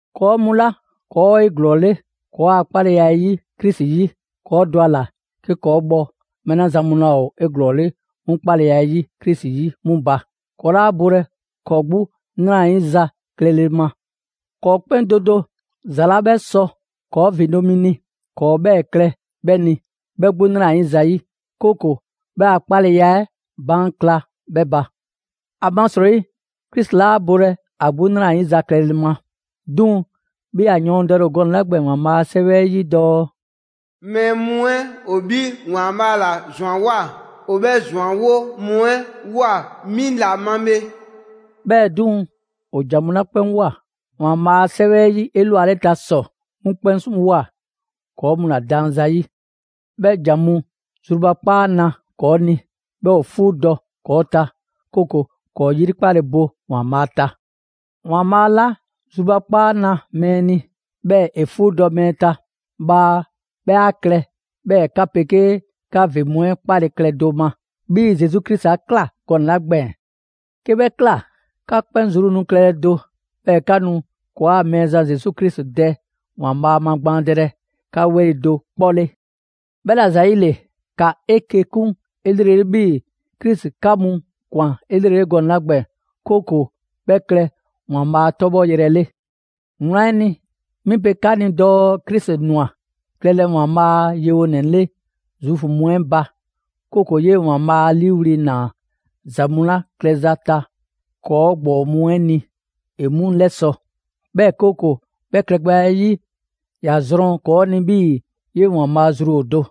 ‑Kɔɔ' mu 'la ‑kɔɔ' ‑o 'eglɔɔle ‑kɔɔa' 'kpaleya 'ɛ 'yi Krisi 'yi, ‑kɔɔ' dɔ ‑a ‑la 'ke ‑kɔɔ' bhɔ mɛɛ 'la zan mu laa ‑o 'eglɔɔle 'mu 'kpaleya 'ɛ 'yi Krisi 'yi 'mu ba. ‑Kɔɔ' 'laa bolɛ ‑kɔɔ' 'gbu 'nrayiza klɛle ma. ‑Kɔɔ' 'kpɛn do do ‑za 'la 'bhɛ sɔ ‑kɔɔ' ‑vindo' mi ni, ‑kɔɔ' 'bhɛɛ‑ klɛ 'bhɛ ni, 'bhɛ 'gbu 'nrayiza 'yi; 'kooko‑ 'bhɛ a 'kpaleya 'ɛ baan' kla 'bhɛ ba. ‑Amasrɔyi Krisi 'laa bolɛ ‑a 'gbu 'nrayiza klɛle ma. 'Duŋ‑ 'bhii‑ ‑a yɔɔndɛle ‑o gɔnɛ‑ 'la gbɛɛn‑ ‑Waanbhaa' a 'Sɛwɛ 'ɛ 'yi dɔɔ: «Mɛɛ mu 'ɛ ‑o 'bhi ‑Waanbhaa' ‑la ‑zwanwoa, ‑o 'bhɛ ‑zwanwo' mu 'ɛ ꞊woa 'mi ‑la ma bhe.» 'Bhɛɛ‑ 'duŋ‑, ‑o ‑jan mu 'la 'kpɛn ꞊woa ‑Waanbhaa' a 'Sɛwɛ 'ɛ 'yi 'elwaleta ‑sɔ, ‑o 'mu 'kpɛn ꞊woa ‑kɔɔ' mu ‑la daan zayi'. 'Bhɛ ‑jan mu zrubakpaa na ‑kɔɔ' ni, 'bhɛɛ‑ ‑o 'fuudɔ‑ ‑kɔɔ' ta; 'kooko‑ ‑kɔɔ' 'yrikpale bo ‑Waanbhaa' ta. ‑Waanbhaa' 'la zrubakpaa na mɛɛ ni, 'bhɛɛ‑ ‑e 'fuudɔ‑ mɛɛ ta, bhaa 'bhɛ 'a klɛ 'bhɛɛ‑ 'ka 'pegee 'ka ‑vin mu 'ɛ 'kpale‑ klɛ do ma, 'bhii‑ Zesu Krisi 'a ꞊kla gɔnɛ‑ 'la gbɛɛn‑. 'Ke 'bhɛ ꞊kla, 'ka 'kpɛn zru nu klɛlɛ do, 'bhɛɛ‑ 'ka nu ‑kɔɔa' Mɛɛzan Zesu Krisi Dɛ ‑Waanbhaa' magbaandɛlɛ 'ka 'weli‑ do 'kpɔ 'le. 'Bhɛla‑ ‑zayile, ‑ka 'eke‑ 'kun 'elrele 'bhii‑ Krisi 'ka mu ꞊kwan 'elrele gɔnɛ‑ 'la gbɛɛn‑, 'kooko‑ 'bhɛ klɛ ‑Waanbhaa' 'tɔbhɔyrɛ 'le. Wlan 'ɛ ni, 'mi pe 'ka ni dɔɔ Krisi ꞊nwa klɛlɛ ‑Waanbhaa' a yewonɛ 'le Zuufu mu 'ɛ ba; 'kooko‑ 'yee‑ ‑Waanbhaa' 'a 'liiwli‑ ꞊naa ‑za mu 'la klɛza ta ‑kɔɔ' ‑gbɔɔ mu 'ɛ ni, ‑e 'mu 'lɛsɔ‑. 'Bhɛɛ‑ 'kooko‑ 'bhɛ klɛgbɛya 'ɛ 'yi, ‑ya zrɔn ‑kɔɔ' ni 'bhii‑ 'yee‑ ‑Waanbhaa' zru ‑o do.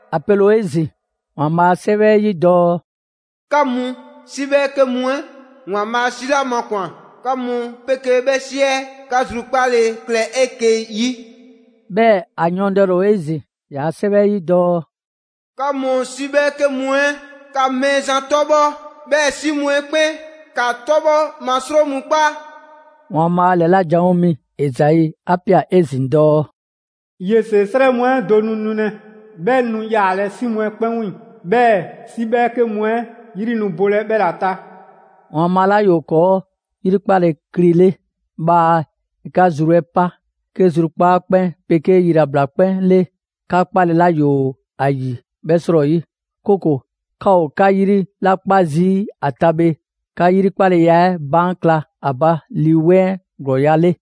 ‑A pele ‑o 'ezin‑ ‑Waanbhaa' a 'Sɛwɛ 'ɛ 'yi dɔɔ: «'Ka mu 'si 'bhɛɛke mu 'ɛ, ‑Waanbhaa' 'si 'la makwan‑, 'ka mu 'pegee 'bhɛ 'si 'ɛ 'ka zrukpaale klɛ 'eke‑ 'yi!» 'Bhɛɛ‑ ‑a yɔɔndɛle ‑o 'ezin‑ 'yaa‑ 'Sɛwɛ 'ɛ 'yi dɔɔ: «'Ka mu 'si 'bhɛɛke mu 'ɛ, ‑ka Mɛɛzan 'tɔbhɔ; 'bhɛɛ‑ 'si mu 'ɛ 'kpɛn, ‑kaa 'tɔbhɔ ma 'sro mu 'kpa!» ‑Waanbhaa' ‑lɛla' janwo mi Ezai 'a ꞊pia 'ezin‑ dɔɔ: «Yese 'srɛ mu 'ɛ do nu nulɛ, 'bhɛ nu yaalɛ 'si mu 'ɛ 'kpɛn 'wiiŋ‑, 'Bhɛɛ‑ 'si 'bhɛɛke mu 'ɛ 'yri nu bolɛ 'bhɛla‑ ta.» ‑Waanbhaa' 'la ‑yoo ‑kɔɔ' 'yrikpale kli 'le, bhaa ‑e 'ka zru 'ɛ pa 'ke zrukpaa' 'kpɛn 'pegee yilabla 'kpɛn 'le 'ka 'kpale‑ 'la ‑yoo ‑a ‑yi 'bhɛ 'srɔyi; 'kooko‑ 'ka ‑o 'ka 'yri 'la 'kpa zii' ‑a ta bhe, 'ka 'yrikpaleya 'ɛ baan' kla a ba Lii 'Weŋ 'ɛ ‑glɔɔya' a 'le.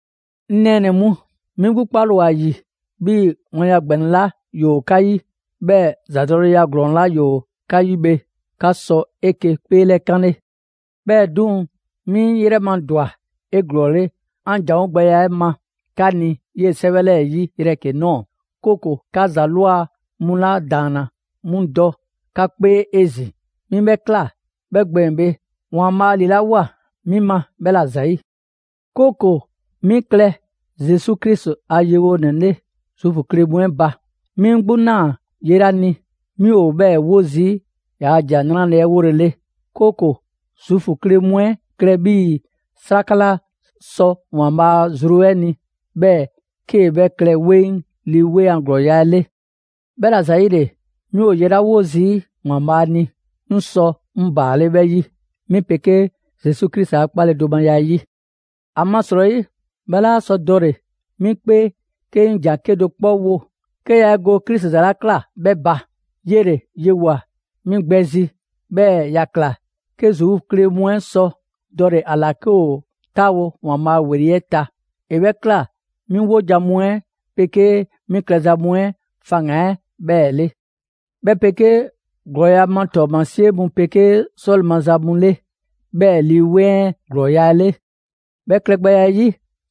'Ŋ nɛɛnɛ‑ mu, 'mi 'gbu 'kpale‑ ‑o ‑a ‑yi 'bhii‑ wlanya ‑gbɛnɛ 'la ‑yoo 'ka 'yi, 'bhɛɛ‑ ‑zadɔleya ‑glɔɔn 'la ‑yoo 'ka 'yi bhe, 'ka sɔ 'eke‑ 'kpeelɛkanle. 'Bhɛɛ‑ 'duŋ‑, 'mi 'ŋ 'yrɛ ma ‑dwa 'eglɔɔle 'an ‑janwo' gbɛya 'ɛ ma 'ka ni 'yee‑ 'sɛwɛ 'lɛɛ‑ 'yi yrɛ 'ke ꞊nɔɔ, 'kooko‑ 'ka ‑za ꞊lwa mu 'la ‑daanna 'mu dɔ 'ka 'kpee 'ezin‑. 'Mi 'bhɛ ꞊kla 'bhɛ gbɛɛn‑ bhe, ‑Waanbhaa' ‑lilawoa 'mi ma 'bhɛ ‑la ‑zayi'; 'kooko‑ 'mi klɛ Zesu Krisi a yewonɛ 'le Zuufu kle mu 'ɛ ba. 'Mi 'ŋ 'gbu ꞊naa ye 'la ni, 'mi ‑o 'bhɛɛ‑ 'wo zii' ‑yaa' ‑Jan 'Nrale‑ 'ɛ 'wolele. 'Kooko‑ Zuufu kle mu 'ɛ klɛ 'bhii‑ 'sraka 'la sɔ ‑Waanbhaa' zru ni, 'bhɛɛ‑ 'kee‑ 'bhɛ klɛ 'weŋ Lii 'Weŋ a ‑glɔɔya' 'ɛ 'le. 'Bhɛla‑ ‑zayile, 'mi ‑o ye 'la 'wo zii' ‑Waanbhaa' ni, 'ŋ sɔ 'ŋ ‑baale' 'bhɛ 'yi, 'mi 'pegee Zesu Krisi a 'kpaledomaya 'ɛ 'yi. ‑Amasrɔyi, 'bhɛ 'laa sɔ dɔle‑ 'mi 'kpee 'ke 'ŋ ‑jan 'kedo‑ 'kpɔ wo, 'ke yaa 'e go Krisi ‑za 'la ꞊kla 'bhɛ ba. 'Yele‑ yewoa꞊ 'mi gbɛ zi, 'bhɛɛ‑ ‑ya ꞊kla 'ke Zuufu kle mu 'ɛ sɔ dɔle‑ ‑a ‑la 'ke ‑o 'taawo ‑Waanbhaa' ‑weli' 'ɛ ta. ‑E 'bhɛ ꞊kla 'mi 'wojan‑ mu 'ɛ 'pegee 'mi klɛza mu 'ɛ faŋgan‑ 'ɛ 'bhɛɛ‑ 'le, 'bhɛ 'pegee ‑glɔɔya ma ‑tɔɔmasie mu 'pegee 'sɔle‑ maza mu 'le, 'bhɛɛ‑ Lii 'Weŋ 'ɛ ‑glɔɔya' a 'le. 'Bhɛ klɛgbɛya 'ɛ 'yi,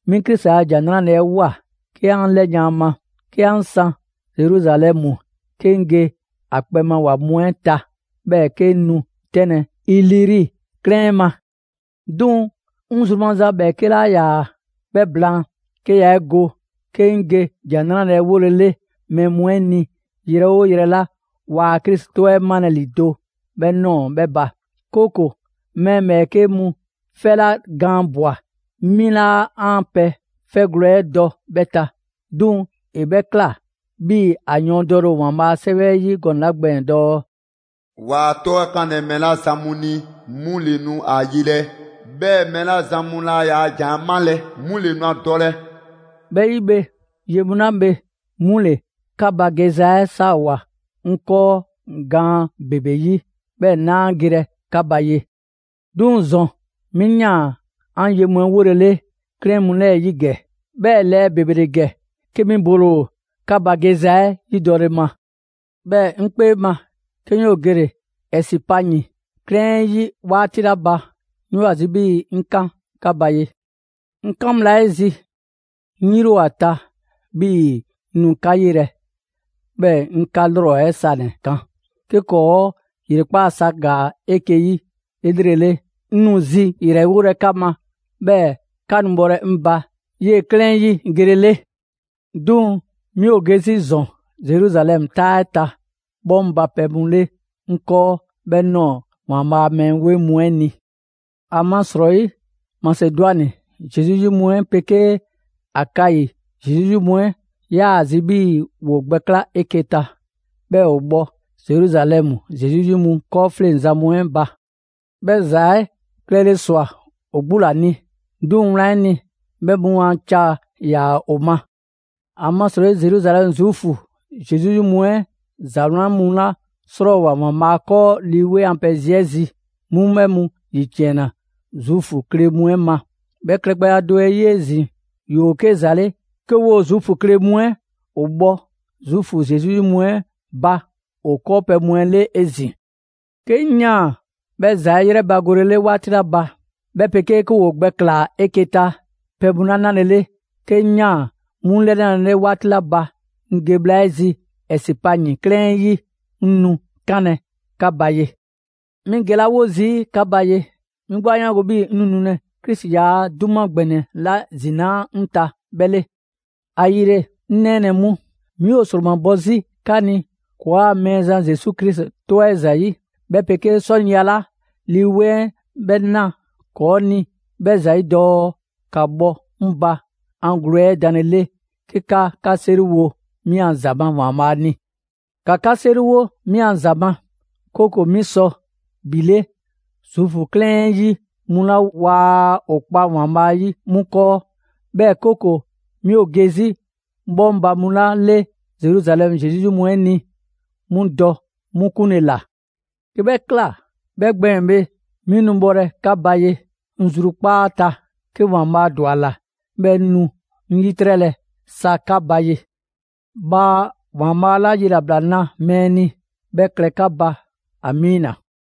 'mi Krisi a ‑Jan 'Nrale‑ 'ɛ ꞊woa 'ke 'an 'lɛyan‑ 'a ma, 'ke 'an san Zeruzalɛmu, 'ke 'ŋ ge ‑a kpɛma ‑wa mu 'ɛ ta, 'bhɛɛ‑ 'ke 'ŋ nu 'tɛnlɛ‑ Iliri 'klɛɛn 'ɛ ma. 'Duŋ‑ 'ŋ zru maza ‑bhɛɛke' 'laa ‑yaa 'bhɛ blaan, 'ke yaa 'e go 'ke 'ŋ ge ‑Jan 'Nrale‑ 'ɛ 'wolɛ‑ mɛɛ mu 'ɛ ni yrɛ 'oo yrɛ 'la waa Krisi 'tɔ 'ɛ 'malɛ‑ ‑lido' 'bhɛ ꞊nɔɔ 'bhɛ ba; 'kooko‑ mɛɛ ‑bhɛɛke' mu 'fɛ 'la gaan ꞊bwa, 'mi 'laa 'an pɛ 'fɛgwlɛ‑ 'ɛ dɔ 'bhɛ ta. 'Duŋ‑, ‑e ꞊kla 'bhii‑ ‑a yɔɔndɛle ‑o ‑Waanbhaa' a 'Sɛwɛ 'ɛ 'yi gɔnɛ‑ 'la gbɛɛn‑ dɔɔ: «Waa ‑a 'tɔ 'ɛ 'kanlɛ‑ mɛɛ 'la zan mu ni, 'mu ‑le nu ‑a yelɛ; 'bhɛɛ‑ mɛɛ 'la zan mu laa ‑yaa' ‑jan 'ɛ 'malɛ‑, 'mu ‑le nu ‑a dɔlɛ.» 'Bhɛ 'yi bhe, ye mu 'la bhe, 'mu ‑le 'ka ba geza 'ɛ 'saawoa‑ 'ŋ 'kɔɔ gaan ‑bebe 'yi, 'bhɛɛ‑ 'naa gelɛ 'ka ba ye. 'Duŋ‑ ‑zɔn 'mi ꞊yaan 'an ye mu 'ɛ 'wolele 'klɛɛn mu 'lɛɛ‑ 'yi ‑gɛ. 'Bhɛ lɛɛ ‑bebe ‑le ‑gɛ, 'ke 'mi bole ‑o 'ka ba geza 'ɛ yidɔle ma. 'Bhɛɛ‑ 'ŋ 'kpee ma, 'ke 'ŋ 'yoo‑ gele‑ Ɛsipayin 'klɛɛn 'ɛ 'yi 'waati 'la ba, 'ŋ 'yoo‑ ‑a zi 'bhii‑ 'ŋ 'kan 'ka ba ye. 'Ŋ 'kan bhla 'ɛ zi, 'ŋ 'yri ‑o ‑a ta 'bhii‑ 'ŋ nu 'ka 'yelɛ‑, 'bhɛɛ‑ 'ŋ 'ka 'lrɔ 'ɛ sanɛ‑ kan. 'Ke ‑kɔɔ' ‑yrekpaa' sa ‑gaa 'eke‑ 'yi 'elrele, 'ŋ nu zi ‑yrɛwolɛ 'ka ma, 'bhɛɛ‑ 'ka nu bhɔlɛ 'ŋ ba 'yee‑ 'klɛɛn 'ɛ 'yi gelele. 'Duŋ‑ 'mi ‑o ge 'zi ‑zɔn Zeruzalɛmu 'taa 'ɛ ta bhɔŋbapɛ mu 'le 'ŋ 'kɔɔ 'bhɛ ꞊nɔɔ ‑Waanbhaa' a mɛɛ 'weŋ mu 'ɛ ni. ‑Amasrɔyi Masedwani Zesu 'yi mu 'ɛ 'pegee Akayi Zesu 'yi mu 'ɛ, 'yaa‑ zi 'bhii‑ ‑woo gbɛkla' 'eke‑ ta, 'bhɛɛ‑ ‑o bhɔ Zeruzalɛmu Zesu 'yi mu 'kɔɔfleŋzan mu 'ɛ ba. 'Bhɛ ‑za 'ɛ klɛle ꞊swa ‑o 'gbu ‑la ni. 'Duŋ‑ wlan 'ɛ ni, 'bhɛ mu a ca ‑yaa ‑o ma. ‑Amasrɔyi Zeruzalɛmu Zuufu Zesu 'yi mu 'ɛ ‑za 'wlan mu 'la 'srɔɔwoa꞊ ‑Waanbhaa' 'kɔɔ Lii a pɛ zi 'ɛ zi, 'mu 'bhɛ mu ‑yiciɛnna Zuufu kle mu 'ɛ ma; 'bhɛ klɛgbɛya do 'ɛ 'yi 'ezin‑, ‑yoo 'ke ‑za 'le 'ke 'woo‑ Zuufu kle mu 'ɛ ‑o bhɔ Zuufu Zesu 'yi mu 'ɛ ba ‑o 'kɔɔpɛ‑ mu 'ɛ 'le 'ezin‑. 'Ke 'ŋ ꞊yaan 'bhɛ ‑za 'ɛ 'yrɛbagolele 'waati 'la ba, 'bhɛ 'pegee 'ke ‑woo gbɛklaa‑ 'eke‑ ta pɛ mu 'la 'nalele, 'ke 'ŋ ꞊yaan 'mu 'lɛnalele 'waati 'la ba, 'ŋ ge bhla 'ɛ zi Ɛsipayin 'klɛɛn 'ɛ 'yi, 'ŋ nu 'kanlɛ‑ 'ka ba ye. 'Mi gelawo zii' 'ka ba ye, 'mi 'gbu 'a 'yaango‑ 'bhii‑ 'ŋ nu nulɛ Krisi ‑yaa' 'duma ‑gbɛnɛ 'la zinaa' 'ŋ ta 'bhɛ 'le. ‑Ayile, 'ŋ nɛɛnɛ‑ mu, 'mi ‑o ‑sromabɔ 'zi 'ka ni ‑kɔɔa' Mɛɛzan Zesu Krisi 'tɔ 'ɛ ‑zayi', 'bhɛ 'pegee 'sɔniya 'la Lii 'Weŋ 'ɛ 'bhɛ na ‑kɔɔ' ni 'bhɛ ‑zayi' dɔɔ ‑ka bhɔ 'ŋ ba 'an gwle 'ɛ danlele 'ke 'ka 'ka 'seriwo 'mi a ‑za ma ‑Waanbhaa' ni. ‑Ka 'ka 'seriwo 'mi a ‑za ma, 'kooko‑ 'mi sɔ ‑bhile Zude 'klɛɛn 'ɛ 'yi mu 'la waa ‑o kpa ‑Waanbhaa' 'yi 'mu 'kɔɔ, 'bhɛɛ‑ 'kooko‑ 'mi ‑o ge 'zi bhɔŋbapɛ mu 'la 'le Zeruzalɛmu Zesu 'yi mu 'ɛ ni, 'mu dɔ 'mu 'kunle‑ ‑la. 'Ke 'bhɛ ꞊kla 'bhɛ gbɛɛn‑ bhe, 'mi nu bhɔlɛ 'ka ba ye, 'ŋ zrukpaa' ta, 'ke ‑Waanbhaa' ‑dwa ‑a ‑la, 'bhɛɛ‑ 'ŋ nu 'ŋ 'yitrɛlɛ sa 'ka ba ye. Bhaa ‑Waanbhaa' 'la yilabla na mɛɛ ni 'bhɛ klɛ 'ka 'kpɛn ba! Amiina!